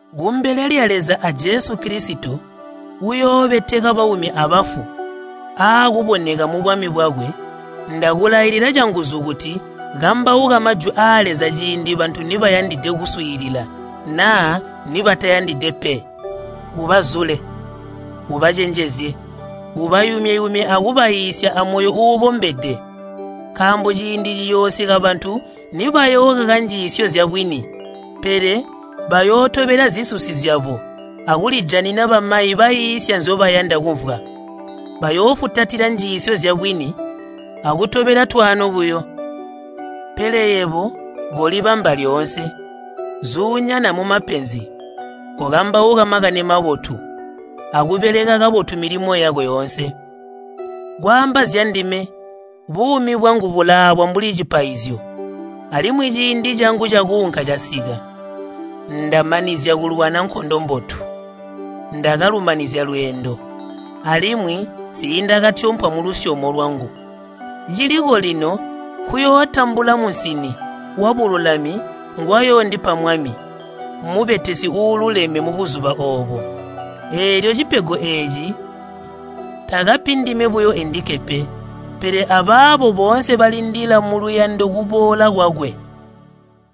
Kumbele lya Leza a Jesu Kilisito uyoobeteka baumi abafu aakuboneka mubwami bwakwe, ndakulailila canguzu kuti kambauka majwi aa Leza ciindi bantu nibayandide kuswiilila naa nibataayandide pe. Ubazule, ubacenjezye, ubayumye-yumye akubaiisya amoyo uubombede. Nkaambo ciindi ciyoosika bantu nibayookaka njiisyo zyabwini pele bayootobela zisusi zyabo akulijanina bamayi baiisya nzyobayanda kumvwa. Bayoofutatila njiisyo zyabwini akutobela twaano buyo. Pele yebo kolibamba lyoonse. Zuunyana mumapenzi. Kokambauka Makani Mabotu, akubeleka kabotu milimo yako yoonse. Kwaamba zyandime, buumi bwangu bulaabwa mbuli cipaizyo, alimwi ciindi cangu cakuunka casika. Ndamanizya kulwana nkondo mbotu, ndakalumanizya lweendo, alimwi nsiindakatyompwa mulusyomo lwangu. Ciliko lino nkuyootambula musini wabululami ngwayoondipa Mwami, mubetesi uululeme mubuzuba oobo. Eelyo cipego eeci takapi ndime buyo endikke pe, pele abaabo boonse balindila muluyando kuboola kwakwe.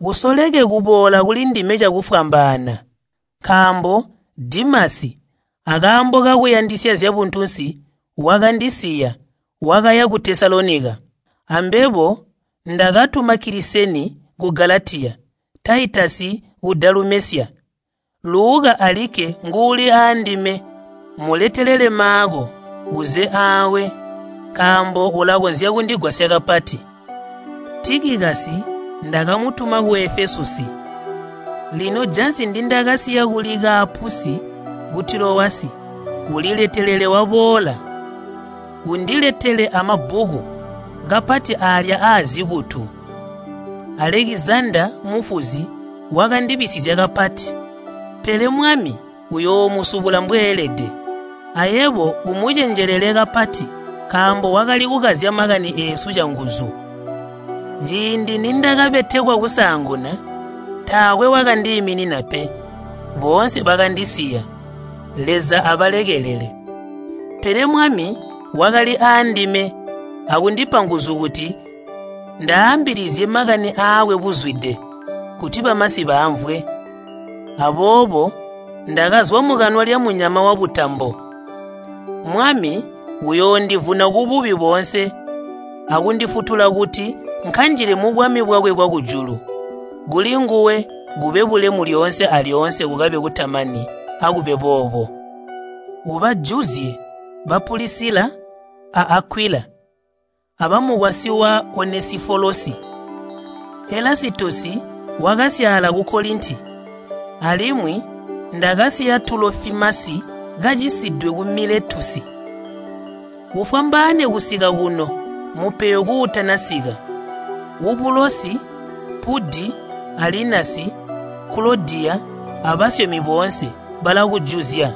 Usoleke kuboola kulindime cakufwambaana. Nkaambo Dimasi akaambo kakuyandisya zyabuntunsi wakandisiya, wakaya ku Tesalonika. Ambebo ndakatuma Kiliseni ku Galatiya, Taitasi ku Dalumesya. Luka alikke nguuli aandime. Muletelele Maako uuze aawe, nkaambo ulakonzya kundigwasya kapati. Tikikasi ndakamutuma ku Efesusi. Lino jansi ndindakasiya kuli Kaapusi ku Tilowasi uliletelele waboola. Undiletele amabbuku, kapati aalya aazikutu. Alekizandaa mufuzi wakandibisizya kapati, pele Mwami uyoomusubula mbweelede. Ayebo umucenjelele kapati nkaambo wakali kukazya makani eesu canguzu. Ciindi nindakabetekwa kusaanguna taakwe wakandiiminina pe, boonse bakandisiya. Leza abalekelele! Pele Mwami wakali aandime akundipa nguzu kuti ndaambilizye makani aakwe buzwide kuti bamasi baamvwe. Aboobo ndakazwa mukanwa lya munyama wabutambo. Mwami uyoondivuna kububi boonse akundifutula kuti nkanjile mubwami bwakwe bwakujulu. Kulinguwe kube bulemu lyoonse alyoonse kukabe kutamani. Akube boobo. Ubajuzye ba Pulisila a Akwila abamukwasyi wa Onesifolosi. Elasitosi wakasyaala ku Kolinti, alimwi ndakasiya Tulofimasi kacisidwe ku Miletusi. Ufwambaane kusika kuno mupeyo kuutanasika. Ubulosi, Pudi a Linasi, Kulodiya, abasyomi boonse balakujuzya.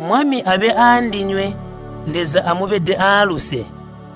Mwami abe aandinywe. Leza amubede aaluse.